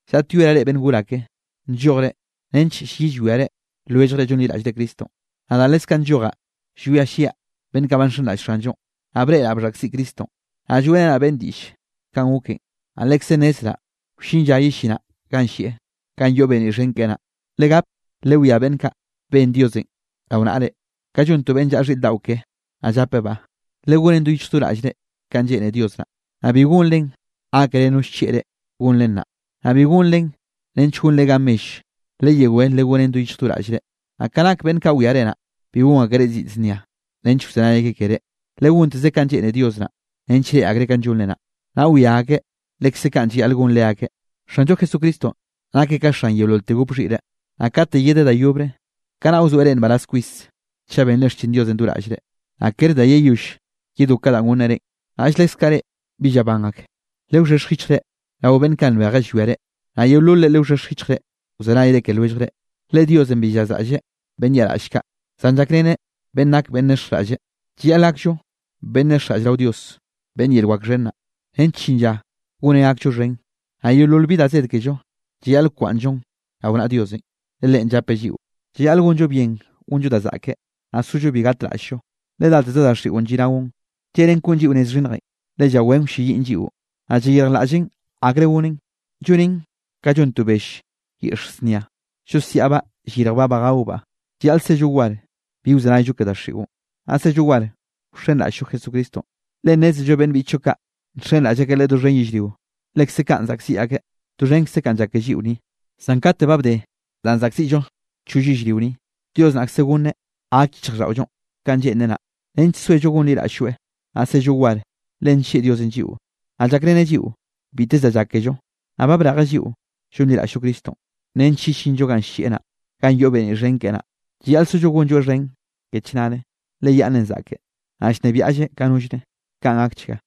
Llaꞌtyoeraꞌ reꞌ beꞌnn gor ake, nllojre nench llyi llwia lwelljre llonliraꞌllre Cristonꞌ. Nadaꞌ leskaꞌ nllojaꞌ llwia llyiaꞌ beꞌnn kaꞌ ba nxenraꞌll Xanllonꞌ, naꞌ breꞌraꞌ bxhaꞌkziꞌ Cristonꞌ, naꞌ lloeꞌrenaꞌ beꞌnne diꞌll kanꞌ goken, naꞌ lekze nnezraꞌ wllin lla yellinaꞌ ganꞌ llieꞌ, ganꞌ yoꞌ beniꞌ xhen keꞌe naꞌ. Legap lewiá beꞌnn kaꞌ ben Diosenꞌ rao naꞌre, ka llon to beꞌnn llaꞌa xhiꞌr daꞌo keꞌe naꞌ llapebaꞌ. Legonen do yich do raꞌllre kanꞌ lleꞌne Dios naꞌ, naꞌ bi gonre gákere no llchieꞌ reꞌ gonren naꞌ, naꞌ bi gonren nench gonre gan mell, leyewé legonen do yichj do raꞌllre. Naꞌ ka nak beꞌnn kaꞌ wiare naꞌ, bi gon akereꞌ ziꞌd znia nench wzenay akeꞌ keré, legonteze kanꞌ lleꞌne Dios naꞌ, nench reꞌe akreꞌ kanꞌ llonre naꞌ, naꞌ wia akeꞌ lekze kaꞌn llayaꞌl gon leakeꞌ. Xanllo Jesucristonꞌ nakeꞌ ka xan yeololte gop xhiꞌre. Naꞌ kate yedeꞌ da yobre, kanaꞌ wzoeꞌ reꞌ nbaraz kwis chaꞌ benre xchin Diosenꞌ do raꞌllre, naꞌ kere da yeyoll yedó ka danꞌ gonneꞌ reꞌn. Naꞌll leskaꞌ reꞌ bi llaban ak, lewxhexj yichjre rao beꞌnn kaꞌ nbeje llwia reꞌ. Naꞌ yeololre lewxhexj yichjre wzenay ke lwelljre, le: Diosenꞌ bi llazraꞌlleꞌ beꞌnn yaꞌraꞌll kaꞌ, zan llakreneꞌ beꞌnn nak beꞌnn nexjraꞌlle. Llayaꞌl gakllo beꞌnn nexjraꞌlle rao Dios beꞌnn yel wak xhen naꞌ, nench llin lla goneꞌ gakllo xhen. Naꞌ yeolol bi da zed kello, llayaꞌl wkwaꞌnnllon rao naꞌa Diosenꞌ, le Leꞌen llapeꞌ lliꞌo. Llayaꞌl gonllo bien gonllo da zaꞌke, naꞌ sollo bi gatraꞌll-llo, le dateze daxiꞌon lliꞌnaon, lleꞌnen koꞌn lliꞌo nez xhinnjenꞌ, le llawén wlleyiꞌn lliꞌon, naꞌ llayirjlaꞌllen akre gonen, llonen ka llon to bell yiꞌx znia, llosiaꞌbaꞌ yirjbaꞌ ba gaobaꞌ. Llayaꞌl sello war, bi wzenayllo ke daxiꞌon, naꞌ sello war wxenraꞌll-llo Jesucristonꞌ, le nnézello beꞌnn biꞌchllo kaꞌ nxenraꞌll akeꞌ Leꞌe doxhen yellrio, lekze kaꞌn zaꞌkziꞌ akeꞌ doxhenkze kanꞌ llak kello ni. Zan kate ba bde danꞌ zaꞌkziꞌllo choll yellrio ni, Dios naꞌkze goneꞌ gak yichjraꞌlldaꞌollonꞌ kanꞌ lleꞌnreꞌ naꞌ, nench soello gonliraꞌll-lloeꞌ, naꞌ sello war. Le nllieꞌ Diosenꞌ lliꞌo, naꞌ llakreneꞌ lliꞌo biteze da llak kello, naꞌ ba brejeꞌ lliꞌo llonliraꞌll-llo Cristonꞌ, nench yellinllo ganꞌ llieꞌ naꞌ, ganꞌ yoꞌ beniꞌ xhen keꞌe naꞌ. Llayaꞌl sollo gonlloeꞌ xhen ke chnare, le yaꞌnnenꞌ zaꞌke, naꞌ llnebiaꞌlleꞌ ka nollre. Kaꞌn gakchga.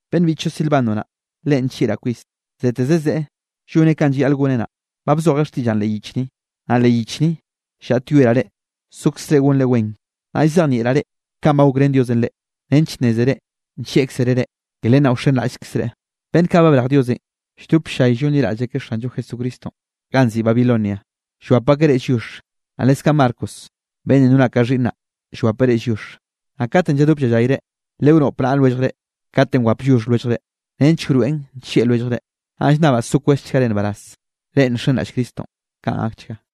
Beꞌnn biꞌchllo Silvano naꞌ, leꞌen nllieꞌraꞌ kwis, zeteze zeꞌe lloneꞌ kanꞌ llayaꞌl goneꞌ naꞌ, ba bzojeꞌ xtiꞌllaꞌn leꞌ yich ni. Naꞌ leꞌ yich ni llaꞌtyoeraꞌ reꞌ sokzre gonre wen, naꞌ llzejnieꞌraꞌ reꞌ kanꞌ ba gokrén Diosenꞌ reꞌ, nench nnézere nllieꞌkzereꞌ reꞌ. Ke len naꞌ wxenraꞌllkzreꞌ. Beꞌnn kaꞌ ba brej Diosenꞌ lldop ll-llay llonliraꞌll akeꞌ Xanllo Jesucristonꞌ ganꞌ nziꞌi Babilonia, llwap akeꞌ reꞌ lliox. Naꞌ leskaꞌ Marcos beꞌnnenꞌ nonaꞌ ka xhiꞌnnaꞌ, llwapeꞌ reꞌ lliox. Naꞌ katenꞌ lladop llallayre, lewnoꞌp naꞌa lwelljre katenꞌ wap lliox lwelljrenꞌ, nench wroeꞌn nllieꞌ lwelljre. Naꞌ llnnabaꞌ so kwezchgare nbaraz, reꞌ nxenraꞌll Cristonꞌ. Kaꞌn gakchga.